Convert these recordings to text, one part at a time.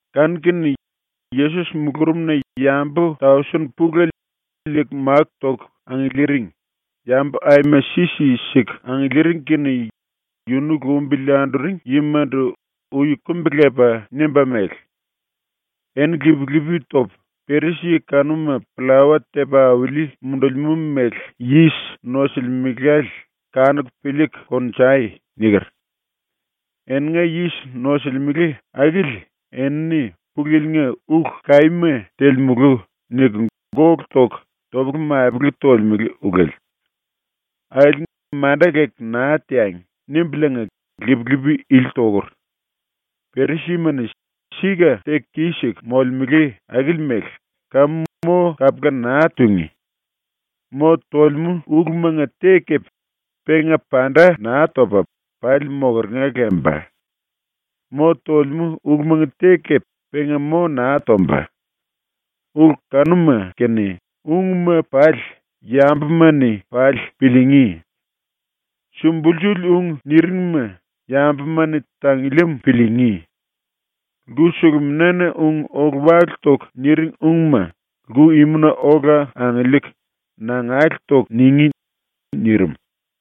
Kanu-kene Yesos mulurumna yambu tausen pulele liiku máku toku angiliiringi, yambu aima si-si siku angiliiring kene yunu lumbili anduring yimandu ui kumbi-lepa nimba mele: “Eni lip-lipi topu, ‘Perisi-yi kanuma pllawa tepa auli mundulimú méle yis nosulimelale kanuku piliiku kongnjai.’ niker. Eninga yis nosulimele akili enini ⸤“Pulu Yili-nga ulu kaíma telemulu.” niku⸥ gólu toku topele-mapele tolemele ulele. ⸤‘Akili manda leku naa teangi.’⸥ nimbuliinga lip-lipi ili tokur. ⸤Perisi-yima-ni sika teku kis-siku molemele akili mele kamu mo kapula naa tungí.⸥ Mo tolemú ulumanga te kepe penga panda naa topa pali mokeringa lemba. Mo tolemú ulumanga te kepe penga mo naa tomba. Ulu kanuma kene ungma pali yambuma-ni pali piliingí. Sumbulsuli ung niringma yambuma-ni tangiliim piliingí. Lku-suluminana ung ólu-wálu toku niring ungma lku-imuna olakundu angiliiku nangale toku ningí.” ⸤nirim.⸥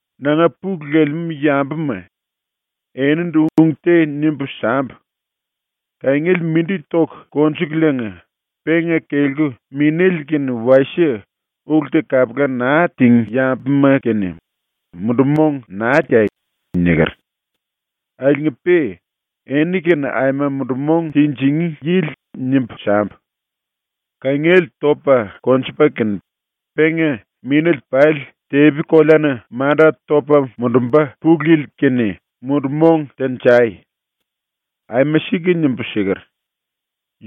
“Nanga pulu lelemú yambuma, enindu ung te nimbu sambu: “Kangiele mindi toku konjukuliinga penga kelku minéle kene wasie ulu te kapula naa tingí yambuma-kene mundu-mong naa teai.” niker. Akiliinga-pe eni-kene aima mundu-mong tinjingí yili nimbu sambu: “Kangiele topa konjupa kene penga minéle pali tepi-koleana manda topa mundumba ⸤Pulu Yili⸥-kene mundu-mong tenjai. Aima sika nimbu siker.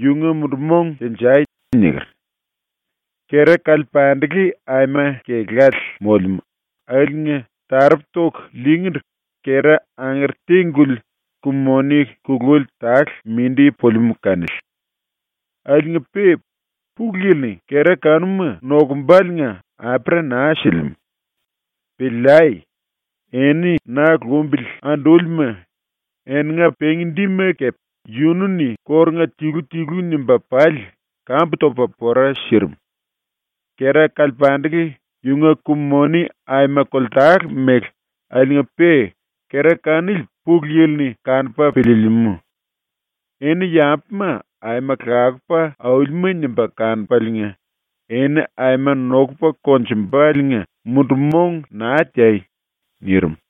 Yunga mundu-mong tenjai.” niker. “Kera kalepandele aima kelále molemú, akiliinga taropu toku liingíndu kera angere te-guli ku-moni kululi tale mindi pulimú kanili. Akiliinga-pe Pulu Yili-ni kera kanuma nokumbaliinga apera naa silimú. Piliai! Eni ⸤na lumbili andúlima⸥, eninga pengi-dima kepe yunu-ni kórunga tilu-tilu nimba pali kambu topa pora sirim. Kera kalepandele yunga ku-moni aima koltale mele akiliinga-pe kera kanili Pulu Yili-ni kanupa piliilimú. Eni yambuma aima lakupa aulima nimba kanupaliinga eni aima nokupa konjumba⸤liinga mundu-mong naa teai.⸥” ⸤nirim.⸥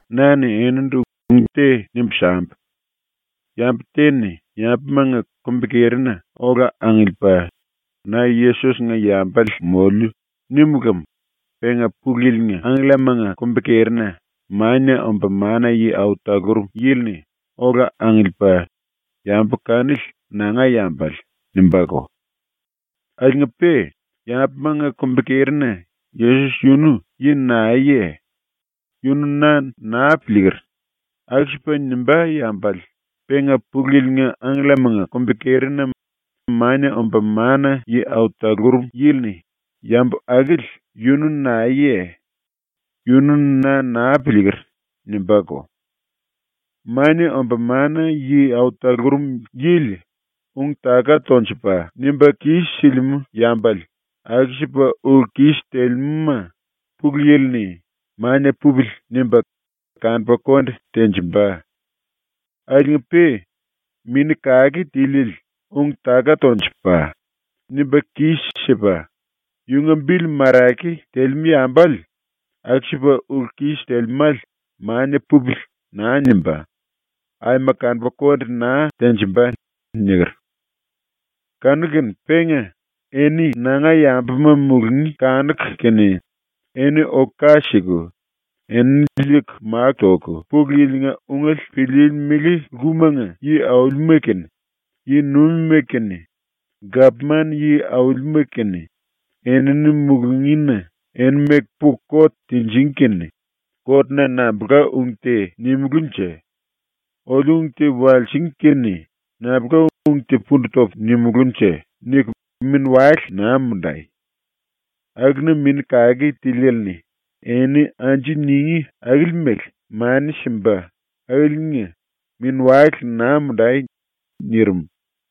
“Na-ni enindu ung te nimbu sambu: “Yambu te-ni yambumanga kumbi-kerina ola angiliipa ‘Na Yesos-nga yambale moliu.’ nímu lem penga Pulu Yili-nga angkellamanga kumbi-kerina Mania Omba Mana-Yi Au Talurum Yili-ni ola angiliipa “Yambu kanili nanga yambale.” nimbáko. Akiliinga-pe yambumanga kumbi-kerina “Yesos yunu yi naeye? Yunu na naa piliiker.” aku-sipa nimbá yambale penga Pulu Yili-nga angkellamanga kumbi-kerina Mania Omba Mana-Yi Au Talurum Yili-ni “Yambu akili yunu naeye? Yunu na naa piliiker.” nimbáko. “Mania Omba Mana-Yi Au Talurum Yili ung-taka tonjupa nimba kis-silimú yambale aku-sipa ulu-kis telemúma ⸤Pulu Yili-ni⸥ ‘Mania pupili.’ nimba kanupa konde tenjimba. Akiliinga-pe Mini Kake Tiliele ung-taka tonjupa, nimba kis-sipa, yunga bili marake telemú yambale aku-sipa ulu-kis telemále ‘Mania pupili.’ naa nimba, aima kanupa konde naa tenjimba.” niker. “Kanu-kene penga eni ⸤nanga yambuma mulungí kanuku kene⸥ eni oku ka siku, enini liiku máku toku Pulu Yili-nga ungele piliilimili lkumanga yi-aulima kene, yi-nuimima kene, gapman yi-aulima kene enini mulungína eni meku puku kot tinjingí kene ‘Kotna nambulka ung te nimulúnje? Oliu ung te walsingí kene nambulka ung te pundu topu nimulúnje?’ niku mini-wale naa mundai. Akuna Mini Kake Tiliele-ni eni anju ningí akili mele mani simba akiliinga mini-wale naa mundai.” nirim.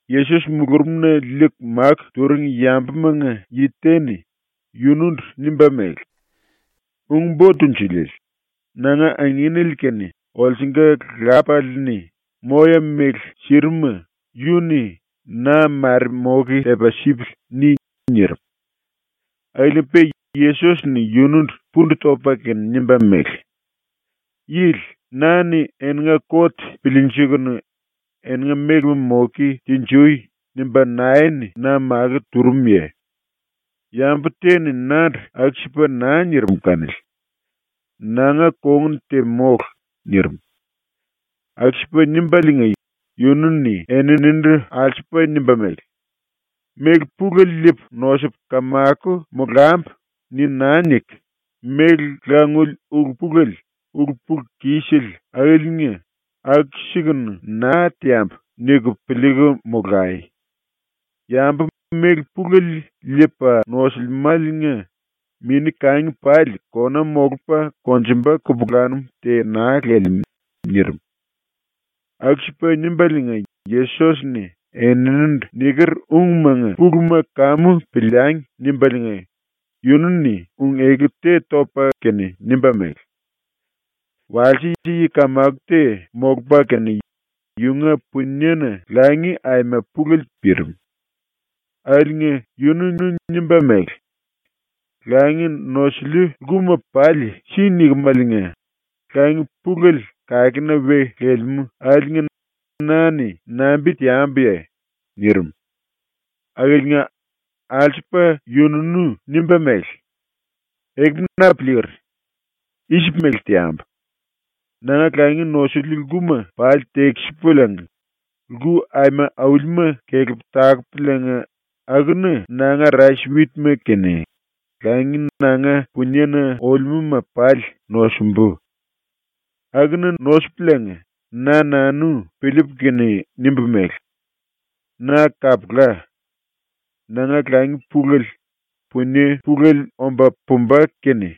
Yesos mulurumna liiku máku turing yambumanga yi te-ni yunundu nimba mele: “Ung-Bo Tunjuliele, nanga anginele kene olsunga lápale-ni moya-méle sirim-ma yunu-ni ‘Na mare moke tepa sipili.’ ni.” nirim. Akiliinga-pe Yesos-ni yunundu pundu topa kene nimba mele: “Yili, ‘Na-ni eninga kot piliinjikunu eninga mélema moke tinjui.’ nimba nae-ni na makó turumuye? Yambu te-ni nandu aku-sipa naa nirim kanili. Nanga kongun te mólu.” nirim. Aku-sipa nimbaliinga yunu-ni eninindu alsupa nimba mele: “‘Méle pulele liipu nosupu kamako molambu.’ ni naa niku, ‘Méle languli ulu-pulele ulu-pulu-kisele akiliinga aku-sikunu naa teambu.’ niku piliiku molai. Yambu méle pulele liipa nosulimáliinga mini-kangi pali kona molupa konjumba kupulanum te naa lelemú.” nirim. ⸤Aku-sipa nimbaliinga Yesos-ni ‘Eninindu niker ungmanga puluma kamu piliangi.’ nimbaliinga⸥ yunu-ni ung-eku te topa kene nimba mele: “Walse yi kamako te molupa kene yunga puniena langi aima pulele pirim. Akiliinga yununú nimba mele: “Langi nosiliu lkuma pali si nikimeliinga, langi pulele kakena we lelemú akiliinga na-ni nambi teambuye?” nirim. Akiliinga alsupa yununú nimba mele: “Ekupu na piliiker. I-sipu mele teambu. Nanga langi nosiliu lkuma pali tekisipuliinga lku aima aulima kelepu takupuliinga akuna nanga rais-witma kene langi nanga puniena olemúma pali nosumbu. Akuna nosupuliinga na nanu piliipu kene nimbu mele: Na kapula. Nanga langi pulele, punie pulele omba pumba kene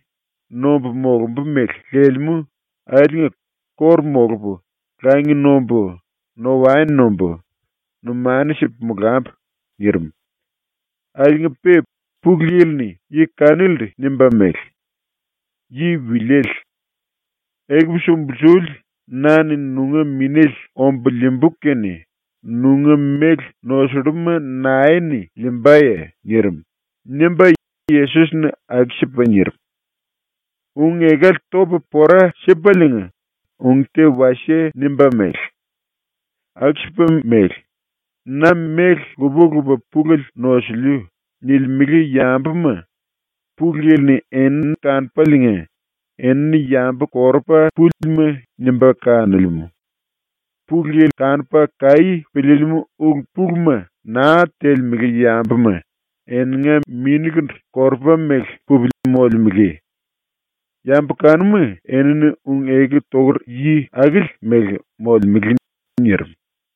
nombu molumbu mele lelemú akiliinga kóru molupu, langi nombu, no-waen nombu, numanu sipu molambu.” nirim. Akiliinga-pe Pulu Yili-ni yi kanilindu nimba mele: “Yi wiliele. Ekupu sumbulsuli na-ni nunga minéle ombu liimbu kene nunga méle nosulluma nae-ni liimbaye?” nirim.” ⸤nimba Yesos-ni aku-sipa nirim.⸥ ⸤Ung-ekale topa pora sipaliinga ung te wasie nimba mele:⸥ “Aku-sipa mele, ‘Na méle lupa-lupa pulele nosiliu.’ nilimele yambuma Pulu Yili-ni enini kanupaliinga enini yambu korupa púlima nimba kanolemú. Pulu Yili kanupa kaí piliilimú ulu-puluma naa telemele yambuma eninga minikundu korupa mele pupili molemele. Yambu kanuma enini ung-eku tokur yi akili mele molemele.” nirim.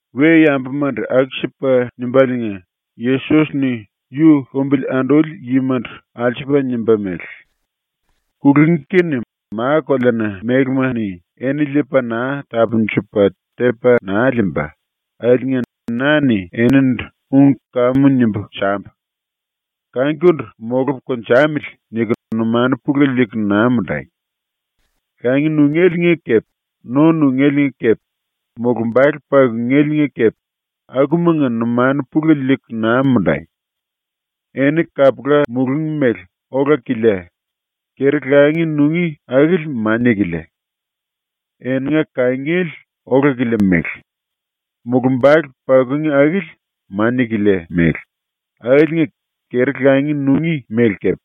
⸤We-yambumandu⸥ aku-sipa nimbaliinga Yesos-ni yu lumbili anduli yimandu alsupa nimba mele: “⸤Kulungí kene ma-koleana mélema-ni eni liipa naa tapundupa tepa naa liimba⸥ akiliinga na-ni enindu ung kamu nimbu sambu: ‘Kangikundu molupu konjamili.’ niku numanu pulele liiku naa mundai. Langi nungéliinga kepe no nungéliinga kepe mulumbale pakungéliinga kepe akumanga numanu pulele liiku naa mundai. Eni kapula mulungí mele ola-kilia, keri-langi nungí akili mania-kilia; eninga kangiele ola-kilia mele, mulumbale pakungí akili mania-kilia mele akiliinga keri-langi nungí mele kepe,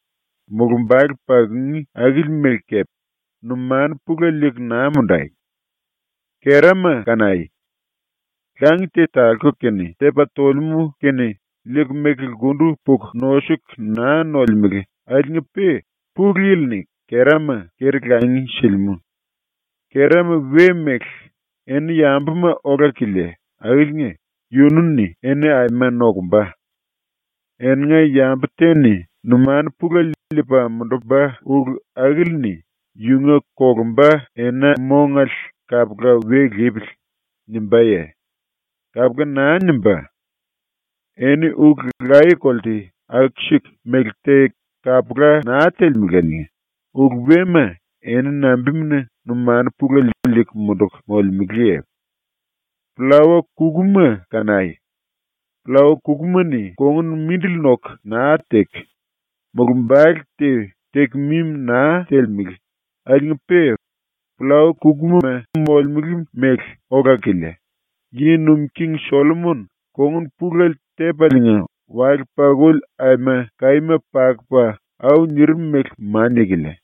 mulumbale pakungí akili mele kepe, numanu pulele liiku naa mundai. Kerama kanai. Langi te talku kene tepa tolemú kene liiku meku lkundu puku nosuku naa nolemele akiliinga-pe Pulu Yili-ni kerama keri-langi silimú. Kerama we-mele, eni yambuma ola-kilia akiliinga yunu-ni eni aima nokumba. Eninga yambu te-ni numanu pulele liipa mundumba ulu akili-ni yunga kolumba ena-mongale kapula ‘We lipili.’ nimbáye? Kapula naa nimbá. Eni ulu laye-kolte aku-siku mele te kapula naa telemeláliinga ulu wema eni nambimuna numanu pulele liiku munduku molemeleye? “Pllawa-kukuma kanai. Pllawa kukuma-ni kongun mindili noku naa teku, mulumbale te teku mimi naa telemele akiliinga-pe pllawa-kukuma molemele mele ola-kilia, ⸤yi nuim king⸥ Sollomon kongun pulele tepaliinga wale-pakuli aima kaíma pakupa au nirim mele mania-kilia.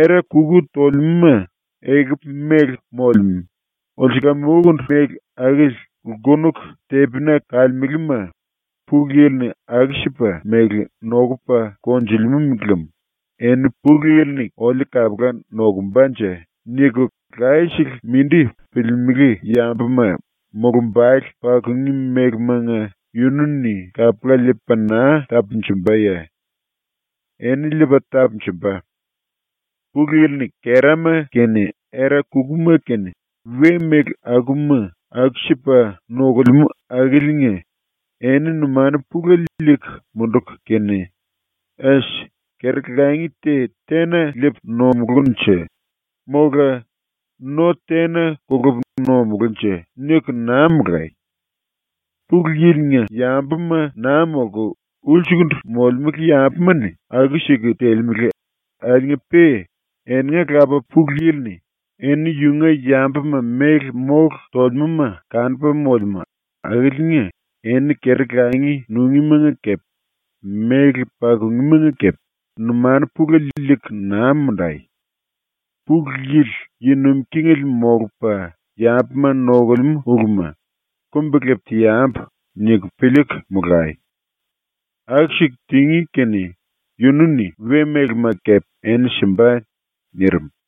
Era-kuku tolemúma ekupu mele molemú, ulsulam-ukundu mele akili lkunuku tepina kalemelema Pulu Yili-ni aku-sipa mele nokupa konjulimú lem eni ‘Pulu Yili-ni oliu kapula nokumbanje?’ niku layesele mindi piliilimili yambuma mulumbale pakungí mélemanga yunu-ni kapula liipa naa tapunjumbaye? Eni liipa tapunjumba. “⸤Pulu Yili-ni kerama kene era-kukuma kene we-méle akuma aku-sipa nokulemú⸥ akiliinga eni numanu pulele liiku munduku kene ‘Es, keri-langi te tena liipu nomulúnje?’; mola ‘No tena kolupu nomulúnje?’ niku naa molai. Pulu Yili-nga yambuma naa molku ulsukundu molemele yambuma-ni aku-siku telemele akiliinga-pe eninga Lapa ⸤Pulu Yili-ni⸥ eni yunga yambuma méle mólu tolemúma kanupa molemú ⸤akiliinga eni keri-langi nungímanga kepe méle pakungímanga kepe numanu pulele liiku naa mundai⸥. ⸤Pulu Yili⸥ yi nuim kingele molupa yambuma nokulemú uluma ‘Kumbi-lepu teambu.’ niku piliiku molai. Aku-siku tingí kene yunu-ni we-mélema kepe eni simba.” ⸤nirim.⸥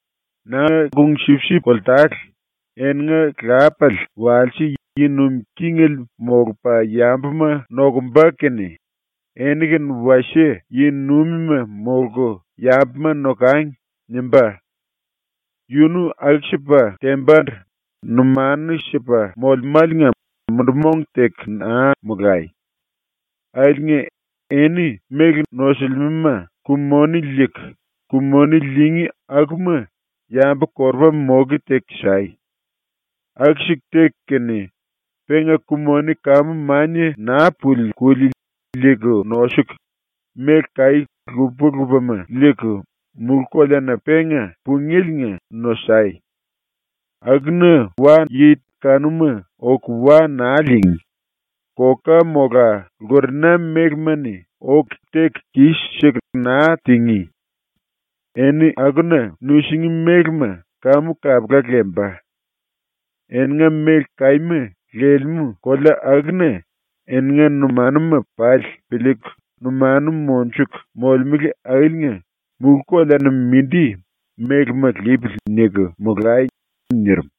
“Nanga kung-sipsip koltale, eninga lápale walse yi nuim kingele molupa yambuma nokumba kene ‘Eni kene wasie yi-nuimima molku yambuma nokangi.’ nimbá. Yunu aku-sipa tembandu numanu sipa molemáliinga mundu-mong teku naa molai. Akiliinga eni méle nosulimelema ku-moni liiku, ku-moni liingí akuma yambu-korupama moke teku sai. Aku-siku teku kene penga ku-moni kamu mania naa puli kuli liiku nosuku, méle kaí lupa-lupama liiku mulú-koleana ⸤penga pungéliinga⸥ nosai. Akuna wa-yi kanuma oku wa naa liingí, koka mola lkurena mélema-ni oku teku kis-siku naa tingí. Eni akuna nusingí mélema kamu kapula lemba. Eninga méle kaíma lelemú kolea akuna eninga numanuma pali piliiku numanu monjuku molemele akiliinga ‘mulú-koleana mindi mélema lipili.’ niku molai.” ⸤nirim⸥.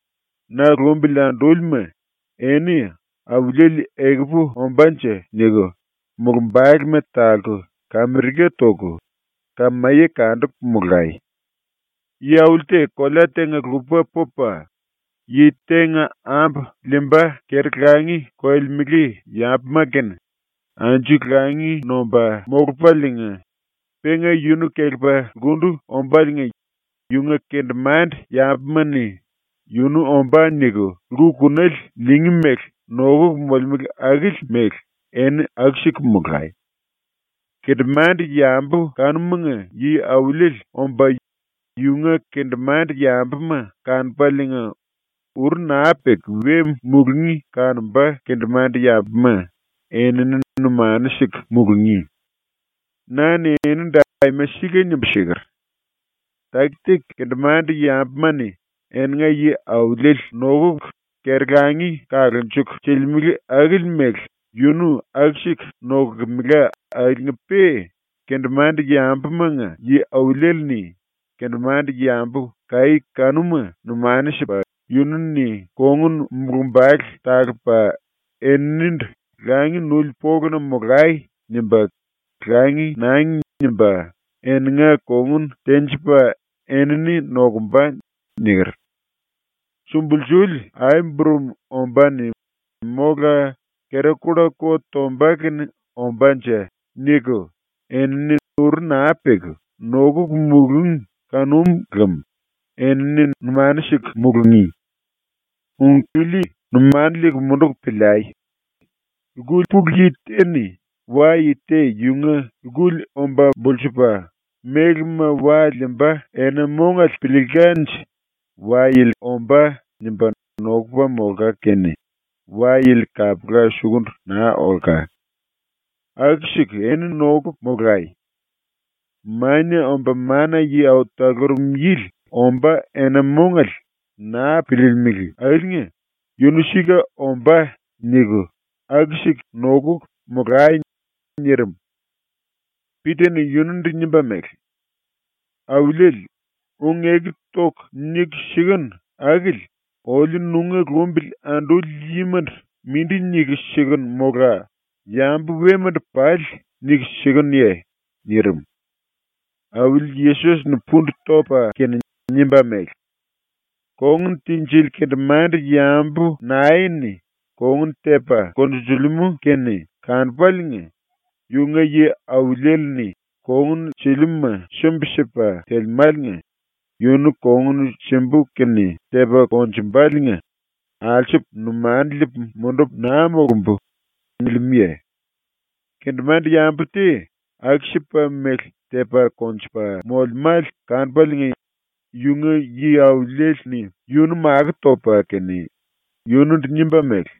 “⸤Na lumbili andúlima,⸥ eni ‘Auliele ekupu ombánje.’ niku mulumbalema talku, kamirika toku, kamaye kanduku, molai. Yi-auli te kolea tenga-lupa pupa, yi tenga ambu liimba keri-langi koyolemele yambuma kene anju langi nomba molupaliinga penga yunu kelepa lkundu ombáliinga yunga kendemande-yambuma-ni ‘Yunu ombá.’ niku lku-kunale liingí mele nokuku molemele akili mele eni aku-siku molai. Kendemande-yambu kanumanga yi-auliele omba yunga kendemande-yambuma kanupaliinga, uru naa peku we mulungí kanomba kendemande-yambuma enini numanu siku mulungí. “Na-ni enindu aima sika nimbu siker: “⸤Taki-taki kendemande-yambuma-ni eninga yi-auliele nokuku keri-langi kalunjuku silimele akili mele yunu aku-siku nokulkemela akiliinga-pe kendemande-yambumanga⸥ yi-auliele-ni ⸤kendemande-yambu kaí kanuma numanu sipa⸥ yunu-ni kongun-mulumbale talupa eninindu “Langi nuli poluna molai.” nimba ‘Langi nangi.’ nimba eninga kongun tenjipa enini nokumba.” niker. Sumbulsuli ai-burum ombáne mola kera-kulla ko tomba kene ombánje niku enini uru naa peku nokuku mulúngi kanum lem enini numanu siku mulungí. “Ung ili numanu liiku munduku piliai. Lku pulu yi te-ni wa-yi te yunga lkuli omba bulsupa mélema wa liimba ena-mongale piliilkanje ‘Wa-yili ombá.’ nimba nokupa molka kene wa-yili kapula sukundu naa olka. Aku-siku eni nokuku molai. Mania Omba Mana-Yi Au Talurum Yili ombá ena-mongale naa piliilimili akiliinga ‘Yunu sika ombá.’ niku aku-siku nokuku molai.” nirim. Pita-ni yunundu nimba mele: “Auliele, ung-eku toku niku sikenu akili oliu ⸤nunga lumbili anduli yimandu mindi⸥ niku sikenu mola yambu wemandu pali niku sikenuye?” nirim. Auli ⸤Yesos-ni⸥ pundu topa kene nimba mele: “Kongun tinjili kendemande-yambu nae-ni kongun tepa konjunjulimú kene kanupaliinga yunga yi-auliele-ni ‘Kongun siliuma sumbi-sipa telemáliinga yunu kongun simbu kene tepa konjumbaliinga alsupu numanu liipu mundupu naa molumbu.’ nilimúye? Kendemande-yambu te aku-sipa mele tepa konjupa molemále kanupaliinga yunga yi-auliele-ni yunu makó topa kene yunundu nimba mele: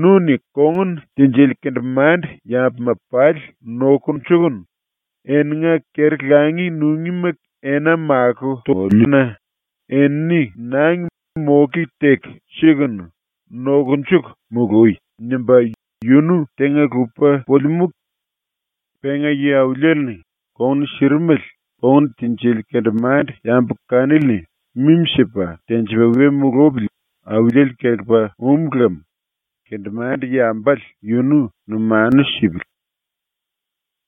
“Nu-ni kongun tinjili kendemande-yambuma pali nokunjuku eninga keri-langi nungíma ena makó toliu-na enini nangi moke teku sikunu, nokunjuku mului.” nimba ⸤yunu tenga-lupa pulimú⸥. Penga yi-auliele-ni kongun sirimele kongun tinjili kendemande-yambu kanili-ni mimi-sipa tenjipa we mulupili auliele kelepa um lem kendemande-yambale yunu numanu sipili.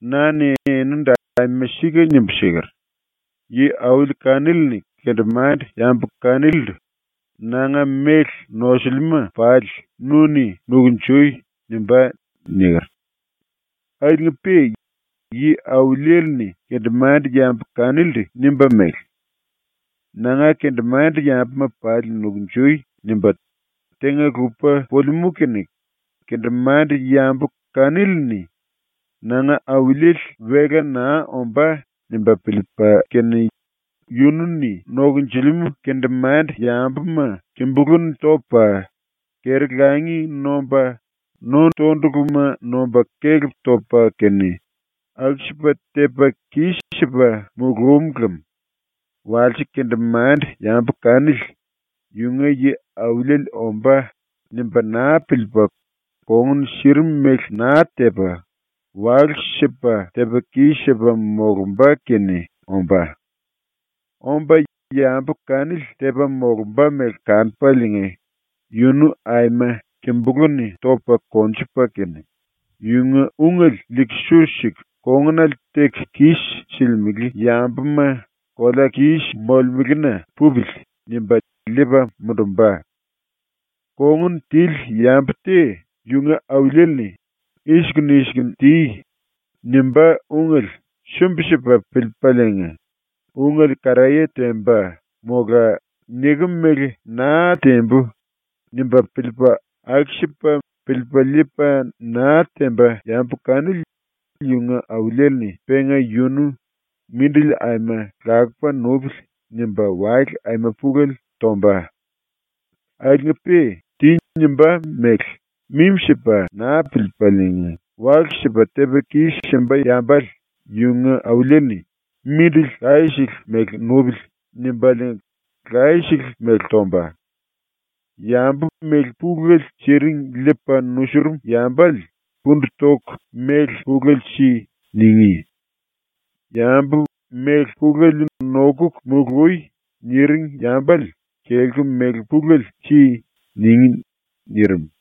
Na-ni enindu aima sika nimbu siker: “Yi-auli kanili-ni kendemande-yi kanilindu “Nanga méle nosiliuma pali nu-ni nukunjui.” nimbá.” niker. “Akiliinga-pe ⸤yi-auliele-ni kendemande-yambu kanilindu nimba mele: “Nanga kendemande-yambuma pali nukunjui.” nimba tenga-lupa pulimú kene⸥ kendemande-yambu kanili-ni “Nanga auliele wela naa ombá.” nimba piliipa kene yunu-ni nokonjilimú kendemande-yambuma kimbulú-ni topa, keri-langi nomba no-tonduluma nomba kelep topa kene, aku-sipa tepa kis-sipa mulúm lem walse kendemande-yambu kanili ‘Yunga yi-auliele ombá.’ nimba naa piliipa ⸤kongun sirim mele naa tepa⸥ walu-sipa tepa kis-sipa molumba kene ombá. Omba ⸤yambu kanili tepa molumba mele kanupaliinga⸥ yunu aima kimbulú-ni topa konjupa kene, yunga ungele liiku su siku kongunale teku kis silimele yambuma ⸤kolea-kis⸥ molemelena ‘Pupili.’ nimba liipa mundumba. “Kongun tili yambu te yunga auliele-ni “I-sikunu i-sikunu ti.” nimbá ungele sumbi-sipa piliipaliinga ungele karaye temba, mola ‘Nikem mele naa tembu.’ nimba piliipa aku-sipa piliipa liipa naa temba yambu kanili yunga auliele-ni penga yunu ‘Mindili aima lakupa nupili.’ nimba wale aima pulele tomba. Akiliinga-pe “Ti.” nimbá mele mimi-sipa naa piliipaliinga walu-sipa tepa kis-simba yambale yunga auliele-ni ‘Mindili layesele mele nupili.’ nimbaliinga laye-sele mele tomba. Yambu méle pulele siring liipa nusurum yambale “Pundu toku méle pulele si.” ningí. Yambu “Méle pulele nokuku mului.” niring yambale “Kelku méle pulele si.” ningí.” ⸤nirim.⸥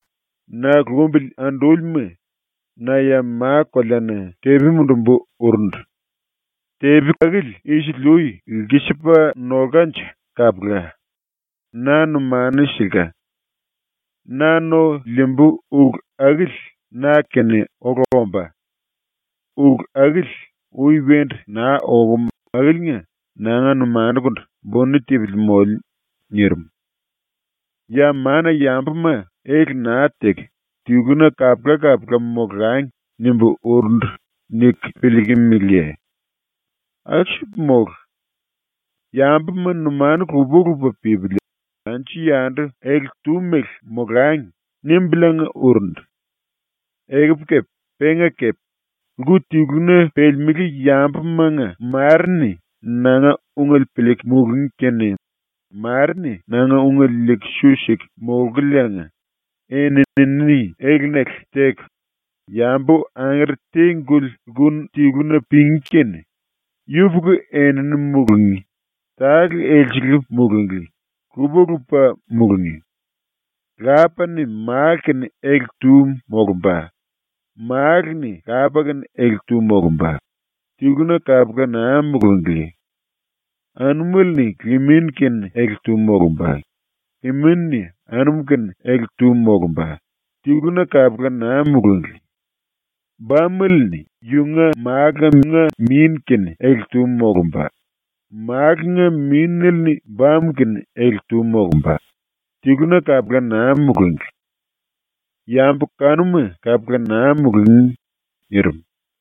“⸤Na lumbili andúlima,⸥ na ya ma-koleana tepi mundumbu urundu. Tepi akili isili-ui lkisipa nolkanje kapula. Na numanu silka. “Na no liimbu ulu akili na-kene ola ombá. Ulu akili ui wendu naa okum akiliinga nanga numanukundu buni tipili moliu.” ⸤nirim.⸥ “‘Ya mana-yambuma ele naa teku tiluna kapula-kapula molangi.’ nimbu urundu niku pillikimiliye? Aku-sipa mólu. ‘Yambuma numanu lupa-lupa pípili anju-yandu ele-tu mele molangi.’ nimbuliinga urundu. Ekupu kepe penga kepe lku tiluna pelemelé yambumanga ⸤mare-ni nanga ungele piliiku mulungí kene mare-ni nanga ungele liiku su siku molkuliinga,⸥ eni-enini elenale teku yambu angere te-guli lku tiluna pengí kene, yupuku enini mulungí, tale elsele mulunglí, lupa-lupa mulungí. lápale-ni málu-kene ele-tu molomba, málale-ni lapa-kene ele-tu molomba, tiluna kapula naa mulunglí. Anumele-ni limin-kene ele-tu molomba, liminele-ni anum-kene ele-tu molomba, tiluna kapula naa mulunglí. Bamele-ni yunga málunga min-kene ele-tu molomba, málunga mínele-ni bamu-kene ele-tu molomba, tiluna kapula naa mulunglí. ⸤Yambu kanuma kapula naa mulungí.⸥” nirim.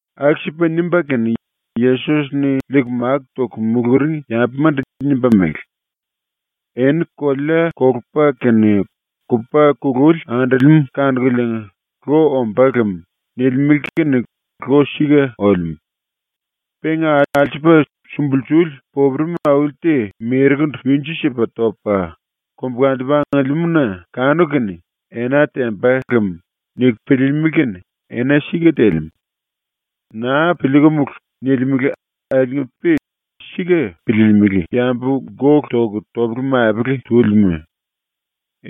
Aku-sipa nimba kene Yesos-ni liiku máku toku muluring yambumandu nimba mele: “Eni kolea kolupa kene kupa kululi andolemú kanukuliinga “Lo ombá lem.” nilimele kene lo sika olemú. Penga alsupa sumbulsuli popuremi auli te merekundu winju-sipa topa, kombukantupu angiliimú-na kanuku kene “Ena temba lem.” niku piliilimili kene ena sika telemú. “⸤Naa piliikumulu.” nilimele akiliinga-pe sika piliilimili⸥ yambu gólu toku topele-mapele túlima!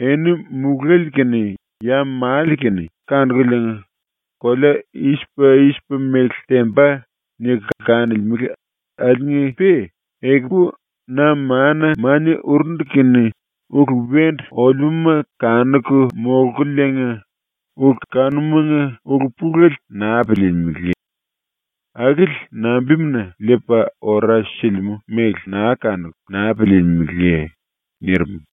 Eni mulále kene ya male kene kanukuliinga ‘kolea i-sipa i-sipa mele temba.’ niku kanolemele akiliinga-pe ekupu ⸤na mana-mania urundu kene⸥ ulu wendu olemúma kanuku molkuliinga ulu kanumanga ulu-pulele naa piliilimili. Akili nambimuna ⸤liipa ora silimú mele⸥ naa kanuku naa piliilimiliye?” ⸤nirim.⸥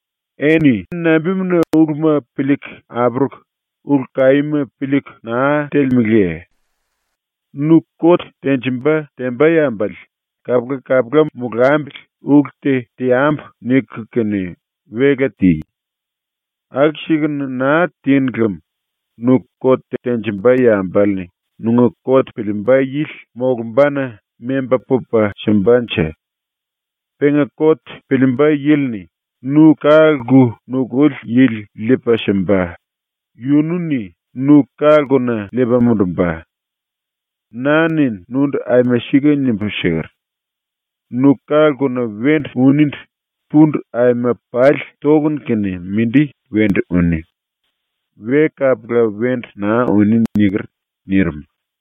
“Eni nambimuna uluma piliiku apuruku ulu-kaíma piliiku naa telemeleye? Nu kot tenjimba temba yambale ‘Kapula-kapula molambili ulu te teambu.’ niku kene wela ti. Aku-sikunu naa tinu lem nu kot tenjimba yambale-ni nunga kot piliimba yili molumbana memba pupa simbanje? Penga kot piliimba yili-ni nu ka-lku nukuli yili liipa simba, yunu-ni nu ka-lkuna liipa mundumba. Na-ni nundu aima sika nimbu siker: “Nu ka-lkuna wendu uníndu pundu aima pali tokunu kene mindi wendu uni. We kapula wendu naa uní.” niker.” nirim.